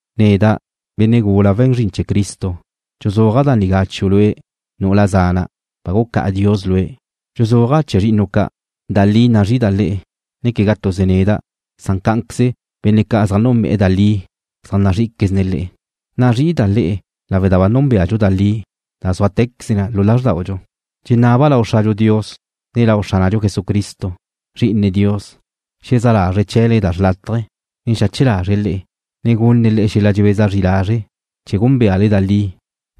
Neda', benne' gula we̱n zrin chee̱ Cristo, dxuzúaja' da nigá chiu' lue', nu'ula zana', ba gucá'a Dios lue'. Dxuzúaja' chee̱ zri'inu' ca'. Da li nazrí'ida' le'e, ne quegá tuze neda', san cá'anqueze benne' ca' zaj núnbe'e̱ da li zaj nazrí'iquezne̱' le'e. Nazrí'ida' le'e lawe' da ba núnbeadxu da li, da súatequeze na xichaj lázrdaudxu. Dxenaba' lau Xradxu Dios, ne lau Xránadxu Jesucristo, Zri'ine Dios, xezá' lazre̱' chee̱le da xrlátaje, ne xache lazre̱' le'e, ne gunne̱' le'e xel-la' dxebeza zri lazre', chee̱ gúnbeale da li,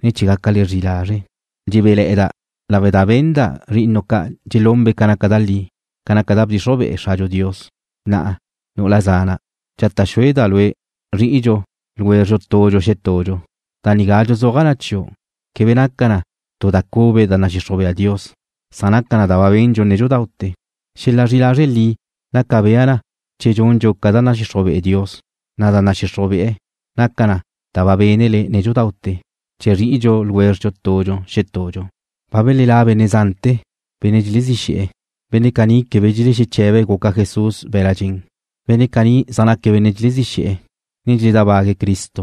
ne chee̱ gácale zri'i lazre'. Dxebéle̱'e̱da' lawe' da ba benda' zri'inu' ca' dxelunbe' ca naca da li, ca naca da bdxixruj be'e Xradxu Dios. Na'a, nu'ula zána'dau', dxata' xúeda' lue' zri'idxu tudxu xetudxu. Da nigá dxuzúaja' chiu' quebe naca na tu da cube da nadxixruj bea Dios, san naca na da ba bendxu nédxudaute̱. Xel-la' zri'i lazre' li naca bea na che dxundxu ca da nadxixruj bea Dios, na' da nadxixruj be'e̱ naca na da ba bénele nédxudaute̱, chee̱ zri'idxu tudxu xetudxu. Ba belelá' benne' zante̱, benne' dxelezí xe̱'e̱. Benne' caní quebe dxelexeche̱be̱' guca Jesús be̱la' dxen. Benne' caní zaj naque̱' benne' dxelezí xe̱'e̱, ne dxeledábague̱' Cristo.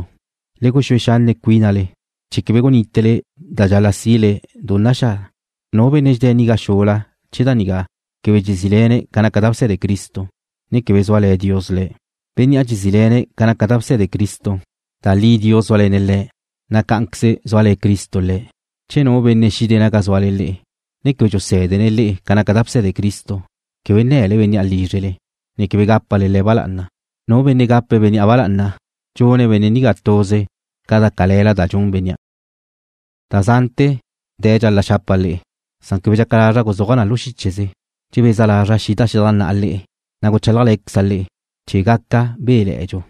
Le guxúe xanne' cuínale chee̱ quebe gunítele da dxal-la sile du naxá'. Nu benne' dxedé̱' nagá xula chee̱ da nigá quebe dxezíle̱ne̱' ca naca da bse̱de Cristo, ne quebe zúale̱ Dios le̱'. Bénnea' dxezíle̱ne̱' ca naca da bse̱de Cristo, da li Dios zúale̱ne̱' Le̱', na' cá'anquez zúale̱ Cristo Le̱'. Che nu benne' xide̱' naga zúale le'e, ne quebe dxusé̱dene̱' le'e ca naca da bse̱de Cristo, quebe nne̱le bénnea' lízrele, ne quebe gápale le̱' ba lá'ana. Nu benne' gape̱' bénnea' ba lá'ana, dxun benne' nigá tuze ca da cale̱la da dxun bénnea'. Da zante̱ dxal-la' xapa' le'e, san quebe dxaca lazra' guzúaja' na lu xícheze. Dxebeza lazra' xida' xedajná'a le'e, na' guchálajle̱queza' le'e, chee̱ gaca béle̱'e̱dxu.